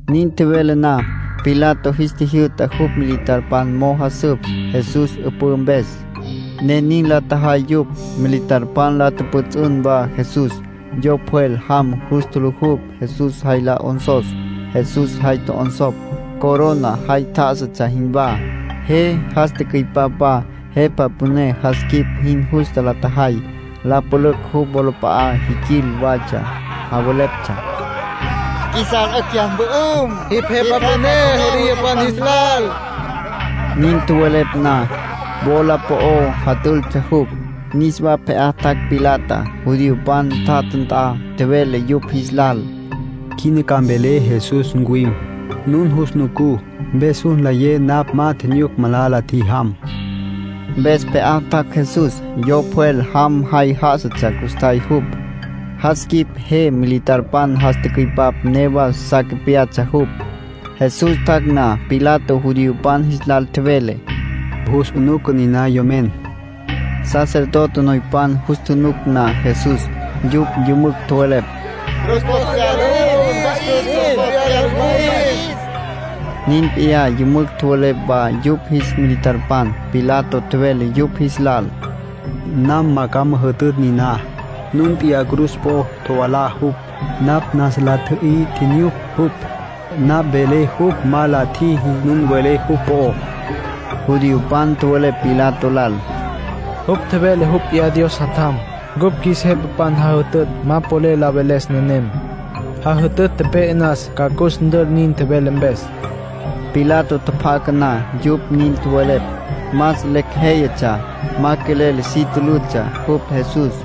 Nin tjevele na, Pilato jis tjijyü'ta jupj militarpan mo'o jasüp Jesús 'üpǘ mpes, ne nin la tjajay yupj. Militarpan la tjüpjüts'ün wa Jesús. Yo pjwel jam jus tjulujupj Jesús jay la 'onsos. Jesús jay tjo'onsopj, corona jay tjá'asatsja jinwá. Je jas tücüipap wa. Jepa püné jas quip jin justa la tjajay. La pülücj jupj wolap'a'a jiquil watsja, javeleptsja: —Qjuisas 'ücj jyas mpü'üm. Jipj jepa püné judiopan jis lal. Nin tjowelepj na, wola po'o jatültsja jupj. Niswa pje'á tjac' Pilatá, judiopan tjatja nt'a. Tjevele yupj jis lal: —Quina ca mvelé Jesús ncuwim, nun jus nucú. Mpes jus nlayé napj ma tjinyuc malala la tjijam. Mpes pje'á tjac' Jesús. Yo pjwel jam jay já'asatsja custjay jupj. Jas quip je militarpan jas tücüipap newa sa capyatsja jupj. Jesús tjac' na, Pilato judiopan jis lal tjevele: —Jus 'unuca niná yomen. Sacerdote noypan jus tjunuc na Jesús, yupj yümücj tjowelepj: —Cruz po'o tjevyala jupj, mpa'is. Cruz po'o tjevyala jupj, mpa'is. Nin p'iyá yümücj tjowelepj wa yupj jis militarpan. Pilato tjevele yupj jis lal: —Nam ma ca müjütütj niná. Nun p'iyá cruz po'o tjovalá jupj. Napj nasa la tji'yüy tjinyuc jupj. Napj velé jupj ma la tjiji nun welé jupj po'ó. Judiopan tjowelepj Pilato lal: —Jupj tjevele jupj p'iyá Dios Jatjam. Ncupj qjuis jepapan jajütütj ma polel la veles nenem. Jajütütj tepe'e nas ca cus ntül nin tjevele mpes. Pilato tjapjaca na yupj nin tjowelepj, más lecj jéyatsja. Ma quelel si tülütsja jupj Jesús.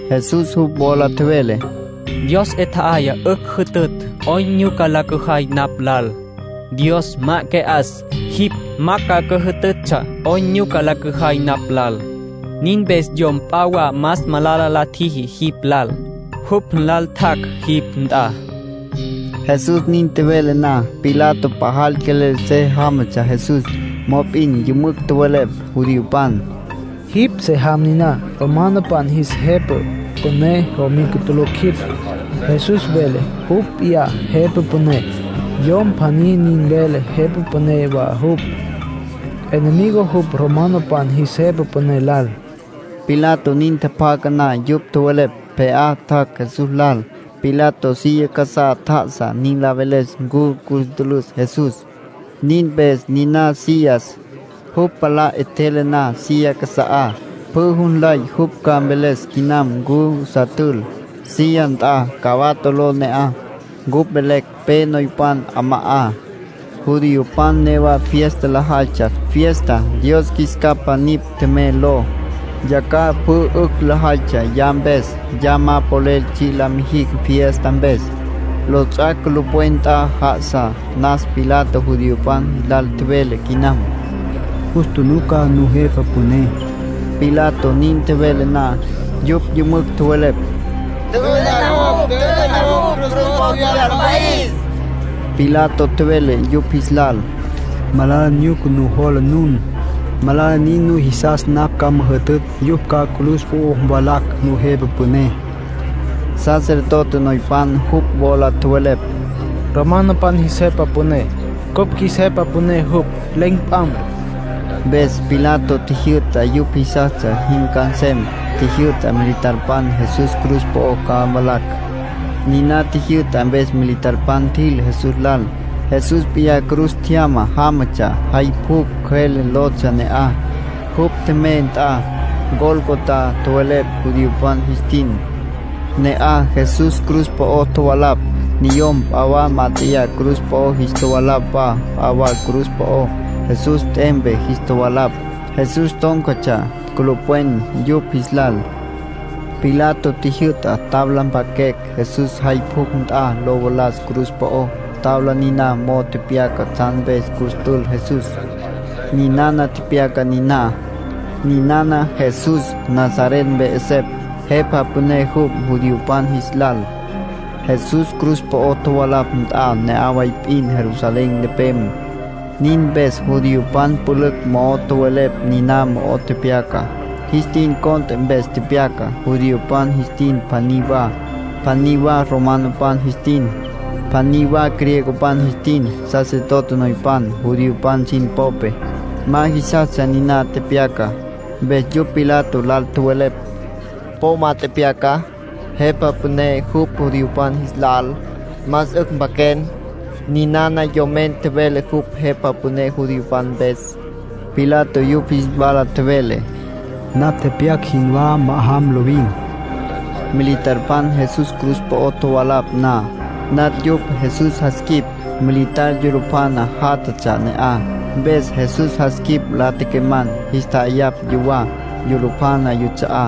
Jesús jupj wola tjevele: —Dios 'e tje'aya 'ücj lo jütütj 'oyn nyuca la cüjay napj lal. Dios ma que'as, jipj ma ca cüjütütsja 'oyn nyuca la cüjay napj lal. Nin mpes yom p'a wa más malala la tjiji jipj lal, jupj nlal tjac' jipj nt'a. Jesús nin tjevele na, Pilato pajal quelel se jamatsja Jesús. Mop'in yümücj tjowelepj judiopan: —Jipj se jam niná, romanopan jis jepa püné jomica tulucj jipj. Jesús vele jupj p'iyá jepa püné. Yom pjaní nin vele jepa püné wa jupj, enemigo jupj romanopan jis jepa püné lal. Pilato nin tjapjaca na yupj tjowelepj, pje'á tjac' Jesús lal. Pilato silla casá tjá'asa nin la veles ncu cus ntülüs Jesús. Nin mpes niná sillas. Jupj palá 'etjele na silla casa'á, pjü jus nlay jupj ca mveles quinam ncu sa tül. Silla nt'a Gabato ló ne'aj. Ncupj velecj “Pe Noypan 'Ama'á”. Judiopan newa fiesta lajaytsja, fiesta “Dios Qjuis Capa Nipj Tjemey” ló. Yacjaj pjü 'ücj lajaytsja ya mpes, ya ma polel tsji' la mijicj fiesta mpes. Lots'ac' culupwen nt'a já'asa nas. Pilato judiopan jis lal tjevele quinam: —Jus tjunuca nujepa püné. Pilato nin tjevele na, yupj yümücj tjowelepj: —¡Tjü'ü'na jupj! ¡Tjü'ü'na jupj! Cruz po'o tjevyala, mpa'is. Pilato tjevele yupj jis lal: —Malala nyuca nujola nun. Malala nin nujisas napj ca müjütütj yupj ca cruz po'o mvalacj nujepa püné. Sacerdote noypan jupj wola tjowelepj: —Romanopan jis jepa püné, cupj qjuis jepa püné jupj. Len̈ p'am. Mpes Pilato tjijyü'ta yupj jisastsja jin ca nsem. Tjijyü'ta militarpan Jesús cruz po'o ca mvalacj. Niná tjijyü'ta mpes militarpan tjil Jesús lal. Jesús p'iyá cruz tjyama jámatsja. Jay Pjucj Cjüele lotsja ne'aj, jupj tjemey nt'a. “Gólgota” tjowelepj judiopan jis tin. Ne'aj Jesús cruz po'o tjovalapj. Niyom p'a wa mat'eyá cruz po'o jis tjovalapj wa p'a wa cruz po'ó. Jesús t'empe jis tjovalapj. Jesús tón̈catsja culupwen yupj jis lal. Pilato tjijyü'ta tabla mpaquecj, Jesús jay pjucj nt'a lo valas cruz po'ó. Tabla niná mo'o tepyaca tsjan mpes cus tül Jesús. Ninana tepyacá niná: NINANA JESÚS, NAZARET MPE 'ESEPJ. JEPA PÜNÉ JUPJ JUDIOPAN JIS LAL. Jesús cruz po'o tjovalapj nt'a ne'aj way p'in Jerusalén nepem. Nin mpes judiopan pülücj mo'o tjowelepj niná mo'o tepyacá. Jis tin cont'e mpes tepyaca, judiopan jis tin pjaní wa, pjaní wa romanopan jis tin, pjaní wa griegopan jis tin. Sacerdote noypan judiopan sin popé, ma jisastsja niná tepyacá. Mpes yupj Pilato lal tjowelepj: —Po ma tepyaca: ‘Jepa püné jupj judiopan jis lal’. Más 'ücj mpaquen: ‘Ninana yomen tjevele jupj jepa püné judiopan mpes’. Pilato yupj jis wala tjevele: —Napj tepyac jinwá ma'ajam lovin. Militarpan Jesús cruz po'o tjovalapj na, natj yupj Jesús jas quip. Militar yulupjana játjatsja ne'aj, mpes Jesús jas quip la tequeman̈, jis tja'ayapj yuwá, yulupjana yuts'a'á.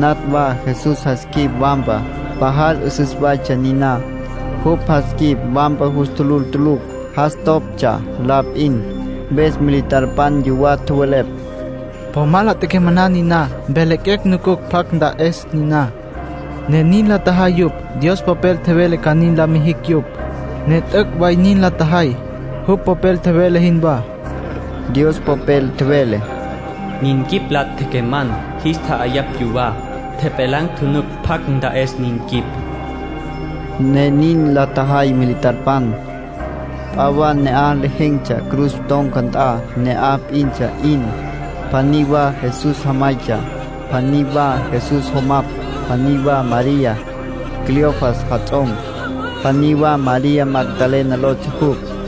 Natj wa Jesús jas quip wampa, pajal 'üsüs waytsja niná. Jupj jas quip wampa jus tjulul tulucj, jas toptsja la p'in. Mpes militarpan yuwá tjowelepj: —Po ma la tequemam niná. Mpjelaquecj nucucj pjacj nta'es niná. Ne nin la tjajay yupj. Dios Popel tjevele ca nin la mijicj yupj, ne t'üc' way nin la tjajay, jupj Popel tjevele jinwá. Dios Popel tjevele: “Nin quip la tequeman̈, jis tja'ayapj yuwá. Tjepjelan̈ tjunuc pjacj nta'es nin quip.” Ne nin la tjajay militarpan. P'a wa ne'aj lejen̈tsja cruz ton̈ca nt'a, ne'aj p'intsja 'in. Pjaní wa Jesús jamaytsja, pjaní wa Jesús jomapj, pjaní wa María, Cleofas jats'om, pjaní wa María Magdalena lotsja jupj.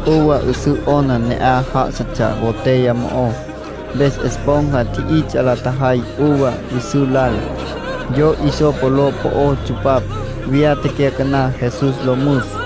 Uva 'üsǘ 'ona ne'aj já'asatsja botella mo'ó. Mpes esponja tji'its'a la tjajay uva 'üsǘ lal, yo hisopo ló po'ó tsupapj, viyá tecyacaná Jesús lo müs.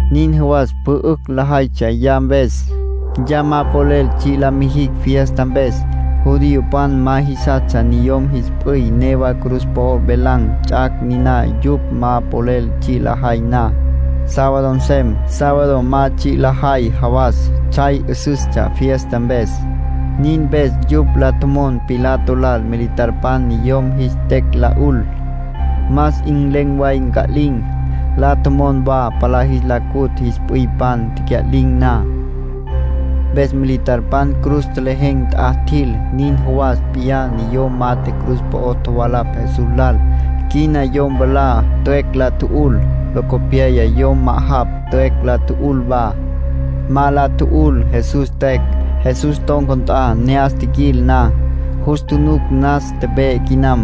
Nin jawas pjü 'ücj lajaytsja ya mpes, ya ma polel tsji' la mijicj fiesta mpes. Judiopan ma jisastsja niyom jis p'üy newa cruz po'o velan̈ ts'ac' niná yupj ma polel tsji' lajay na, sábado nsem. Sábado ma tsji' lajay jawas tsjay 'üsüstsja fiesta mpes. Nin mpes yupj la tjomon Pilato lal militarpan niyom jis tecj la 'ul, más 'in len̈ way nca'lin̈. La tjomon wa palá jis la cutj jis p'üypan tecya'lin̈ na. Mpes militarpan cruz tjelejen̈ nt'a tjil. Nin jawas p'iyá niyom mat'e cruz po'o tjovalapj Jesús lal. Quina yom mwalá tüecj la tju'ul. Locopyaya yom ma'ajapj tüecj la tju'ul wa. Ma la tju'ul Jesús tüecj. Jesús ton̈ca nt'a ne'as tjiquil na, jus tjunuc nas tepe'e quinam.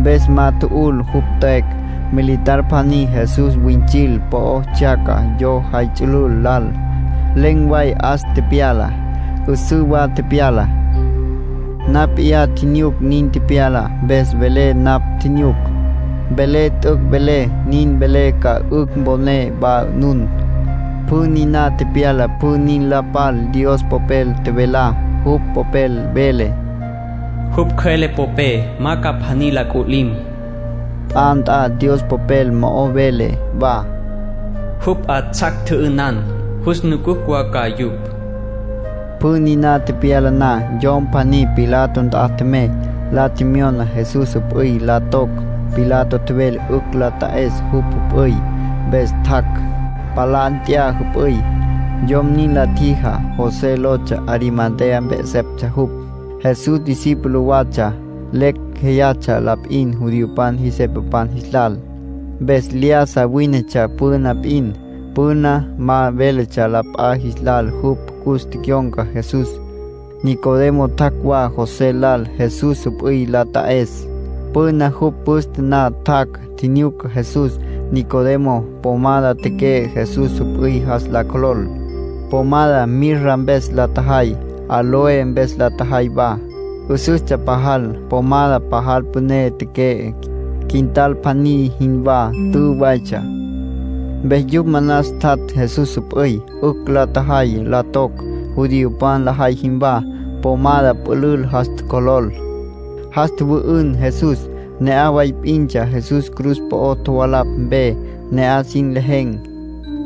Mpes ma tju'ul jupj tüecj. Militar pjaní Jesús wüints'il po'o tsjyaca yo jay ts'ülül lal. Len̈ way 'as tepyala, 'üsǘ wa tepyala. Napj p'iyá tjinyuc nin tepyalá, mpes velé napj tjinyuc. Velé t'üc' velé. Nin velé ca 'ücj mponé wa nun. Pjü niná tepyala pjü nin la pal Dios Popel tjevelá. Jupj Popel vele: “Jupj cjüele popé ma ca pjaní la c'ulim”. P'a nt'a Dios Popel mo'ó vele wa: “Jupj 'atsjac, tjü'ünan, jus nucucj wa ca yupj”. Pjü niná tepyala na, yom pjaní Pilato nt'a tjemey, la tjemyona Jesús jüp'üy la toc. Pilato tjevele 'ücj la ta'es jupj jüp'üy, mpes tjac', palá nt'ya jüp'üy. Yom nin la tjijá José lotsja. Arimatea mpe 'eseptsja jupj. Jesús discípulo watsja. Lecj jéyatsja la p'in judiopan jis jepapan jis lal, mpes lyájasa wínetsja püna p'in; püna ma véletsja la p'a jis lal jupj cus tecyon̈ca Jesús. Nicodemo tjac' wa José lal Jesús jüp'üy la ta'es. Püna jupj püste na tjac', tjinyuca Jesús. Nicodemo pomada teque'e Jesús jüp'üy jas la cjolol. Pomada mirra mpes la tjajay, áloe mpes la tjajay wa, 'üsüstsja pajal. Pomada pajal püné teque'e, quintal pjaní jinwá tü waytsja. Mpes yupj manas tjat' Jesús jüp'üy, 'ücj la tjajay la toc, judiopan lajay jinwá. Pomada pülül jas tjocjolol, jas tjüwü'ün Jesús. Ne'aj way p'intsja Jesús cruz po'o tjovalapj mpe, ne'aj sin lejen̈.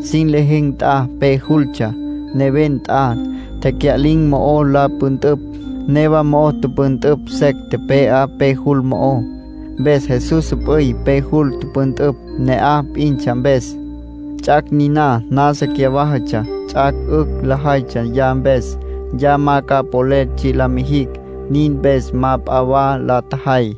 Sin lejen̈ nt'a pe jultsja, neven nt'a, tecya'lin̈ mo'o la püntüpj. Newa mo'o püntǘ secj tepe'á pe jul mo'ó. Mpes Jesús jüp'üy pe jul tüpüntüpj, ne'aj p'intsja mpes. Ts'ac' niná nasa cyawájatsja, ts'ac' 'ücj lajaytsja ya mpes. Ya ma ca polel tsji' la mijicj. Nin mpes ma p'a wa la tjajay.